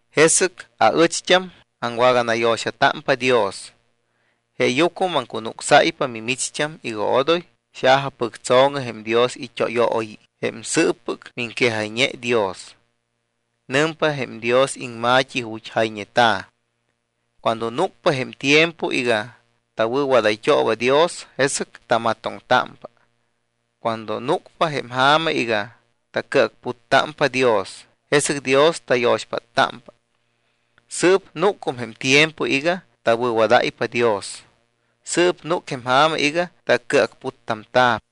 Jesɨc aɨcht́am aŋwaganayo̱xatámpa Dios, jeeyucmɨ maŋcunucsáypa mimicht́am iga odoy xajapɨctso̱ŋɨ jém Dios it́óyooyi, jém sɨɨppɨc miŋquejayñe Dios. Nɨmpa jém Dios iŋma̱t́i ju̱t́ jayñeta̱: Cuando núcpa jém tiempo iga tawɨ̱wadayt́ooba Dios, jesɨc tamatoŋtámpa. Cuando núcpa jém ja̱ma iga tacɨacputtámpa Dios, jesɨc Dios tayo̱xpáttámpa. Sɨɨp núcum jém tiempo iga tawɨ̱wadáypa Dios. Sɨɨp núc jém ja̱ma iga tacɨacputtamta̱p.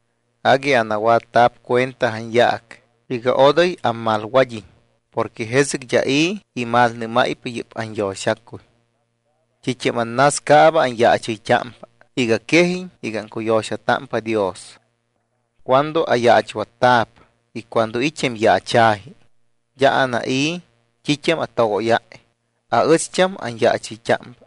Agui anawatta̱p cuenta anyaac iga odoy ammalwad́iñ porque jesɨc d́a i̱ imalnɨ́máypa yɨ́p anyo̱xacuy. T́it́am annascaaba anyaachɨyt́ámpa iga quejiñ iga aŋcuyo̱xatámpa Dios. Cuando ayaachwatta̱p y cuando it́ jém yaacha̱ji, d́a anai̱ t́it́am atogóyáy, aɨcht́am anyaachɨyt́ámpa.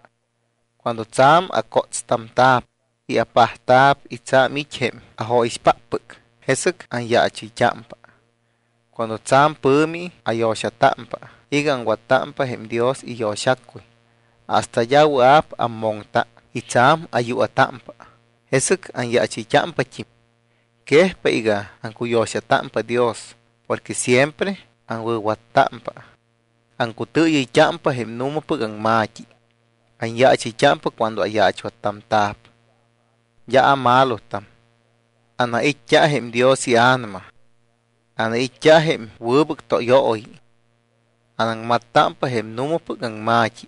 Cuando tsa̱m acótstamta̱p y apajtamta̱p y tsa̱m it́ jém ajóyixpáppɨc, jesɨc anyaachɨyt́ámpa. Cuando tsa̱m pɨ̱mi ayo̱xatámpa iga aŋwattámpa jém Dios iyo̱xacuy hasta d́a wɨa̱p ammoŋta y tsa̱m ayua̱támpa, jesɨc anyaachɨyt́ámpat́im. Quejpa iga aŋcuyo̱xatámpa Dios porque siempre aŋwɨ̱wattámpa, aŋcutɨɨyɨyt́ámpa jém nu̱mapɨc aŋma̱t́i, anyaachɨyt́ámpa cuando ayaachwattamta̱p, d́a amalotam, anait́t́a jém Dios iA̱nama, anait́t́a jém wɨbɨc tóyooyi. Anaŋmattámpa jém nu̱mapɨc aŋma̱t́i,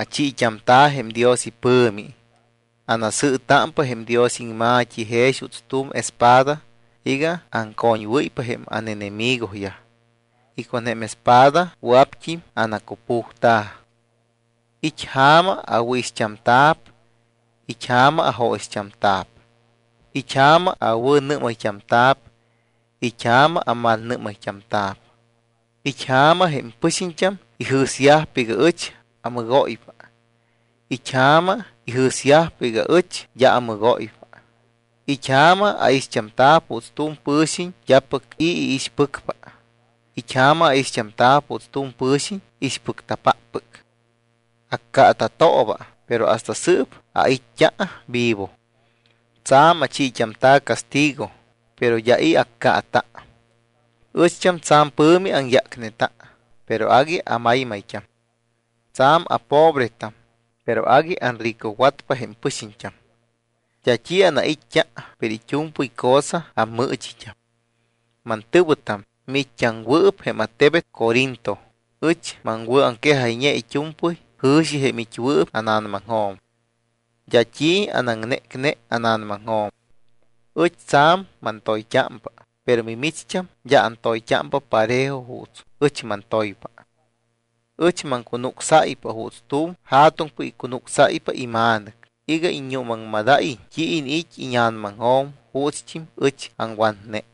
achiit́amta̱ jém Dios ipɨ̱mi, anasɨɨtámpa jém Dios iŋma̱t́i jex juuts tu̱m espada iga aŋcoñwɨ́ypa jém ánenemigoyaj y con jém espada wɨa̱pt́im anacupujta̱. It́ ja̱ma awɨ̱ixt́amta̱p, it́ ja̱ma ajóyixt́amta̱p. It́ ja̱ma awɨ̱nɨ́mayt́amta̱p, it́ ja̱ma amalnɨ́mayt́amta̱p. It́ ja̱ma jém pɨxiñt́am ijɨ̱syajpa iga ɨch amɨgóypa, it́ ja̱ma ijɨ̱syajpa iga ɨch d́a amɨgóypa. It́ ja̱ma aixt́amta̱p juuts tu̱m pɨ̱xiñ d́apɨc i̱ iixpɨcpa, it́ ja̱ma aixt́amta̱p juuts tu̱m pɨ̱xiñ ixpɨcta̱páppɨc. Accaata̱tooba, pero hasta sɨɨp ait́t́a vivo. Tsa̱m achiit́amta̱ castigo, pero d́a i̱ accaata. Ɨcht́am tsa̱m pɨ̱mi aŋyácneta, pero agui amaymayt́am. Tsa̱m apobretam, pero agui anricowatpa jém pɨxiñt́am. D́a t́i anait́t́a, pero it́u̱mpɨy cosa ammɨɨchit́am. Mantɨ̱wɨtam, miit́t́aŋwɨɨp jém attebet Corinto, ɨch maŋwɨ̱aŋquejayñe it́u̱mpɨy jɨ̱xi jém it́wɨɨp ána̱namaŋjo̱m. D́a t́i anaŋnécne ána̱namaŋjo̱m. Ɨch tsa̱m mantoyt́ámpa, pero mimicht́am d́a antoyt́ámpa parejo juuts ɨch mantoypa. Ɨch maŋcunucsáypa juuts tu̱m ja̱tuŋpɨc icunucsáypa ima̱nɨc iga iññuumaŋmadáyiñ t́i iniit́ íña̱namaŋjo̱m juutst́im ɨch aŋwatne.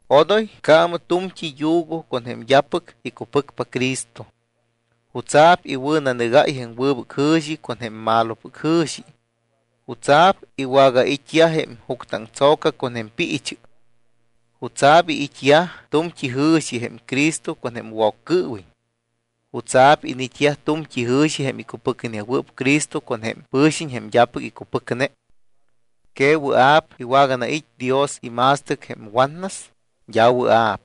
Odoy accaamɨ tu̱mt́i yugo con jém d́apɨc icupɨcpa Cristo. ¿Jutsa̱p iwɨ̱nanɨgáy jém wɨbɨc jɨ̱xi con jém malopɨc jɨ̱xi? ¿Jutsa̱p iwagait́yaj jém juctɨaŋtso̱ca con jém piichɨ? ¿Jutsa̱p iniit́yaj tu̱mt́i jɨ̱xi jém Cristo con jém Woccɨɨwiñ? ¿Jutsa̱p iniit́yaj tu̱mt́i jɨ̱xi jém icupɨcnewɨɨp Cristo con jém pɨ̱xiñ jém d́apɨc icupɨcne? ¿Que wɨa̱p iwaganait́ Dios ima̱stɨc jém watnas? D́a wɨa̱p.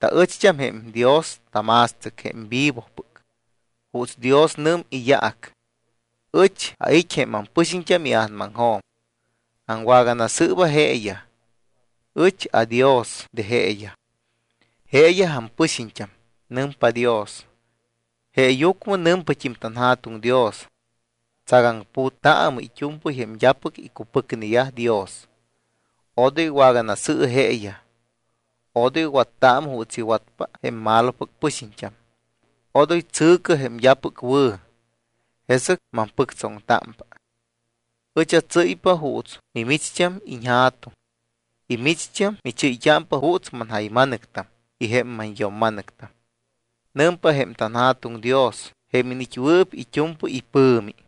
Taɨcht́am jém Dios tama̱stɨc jém vivopɨc. Juuts Dios nɨm iyaac: Ɨch ait́ jém ampɨxiñt́am ia̱namaŋjo̱m, aŋwaganasɨɨba jeeyaj. Ɨch aDios de jeeyaj. Jeeyaj ampɨxiñt́am, nɨmpa Dios. Jeeyucmɨ nɨmpat́im tanJa̱tuŋ Dios: Tsagaŋputtaamɨ it́u̱mpɨy jém d́apɨc icupɨcneyaj Dios. Odoy waganasɨ̱ɨ jeeyaj. Odoy wattaamɨ juuts iwatyajpa jém malopɨc pɨxiñt́am. Odoy tsɨ̱cɨ jém d́apɨc wɨ̱. Jesɨc mampɨctsoŋtámpa. Ɨch atsɨ́ypa juuts mimicht́am iñJa̱tuŋ y mimicht́am michɨ́yt́ámpa juuts manjayma̱nɨctam y jém manyo̱mma̱nɨctam. Nɨmpa jém tanJa̱tuŋ Dios jém iniit́wɨɨp it́u̱mpɨy ipɨ̱mi.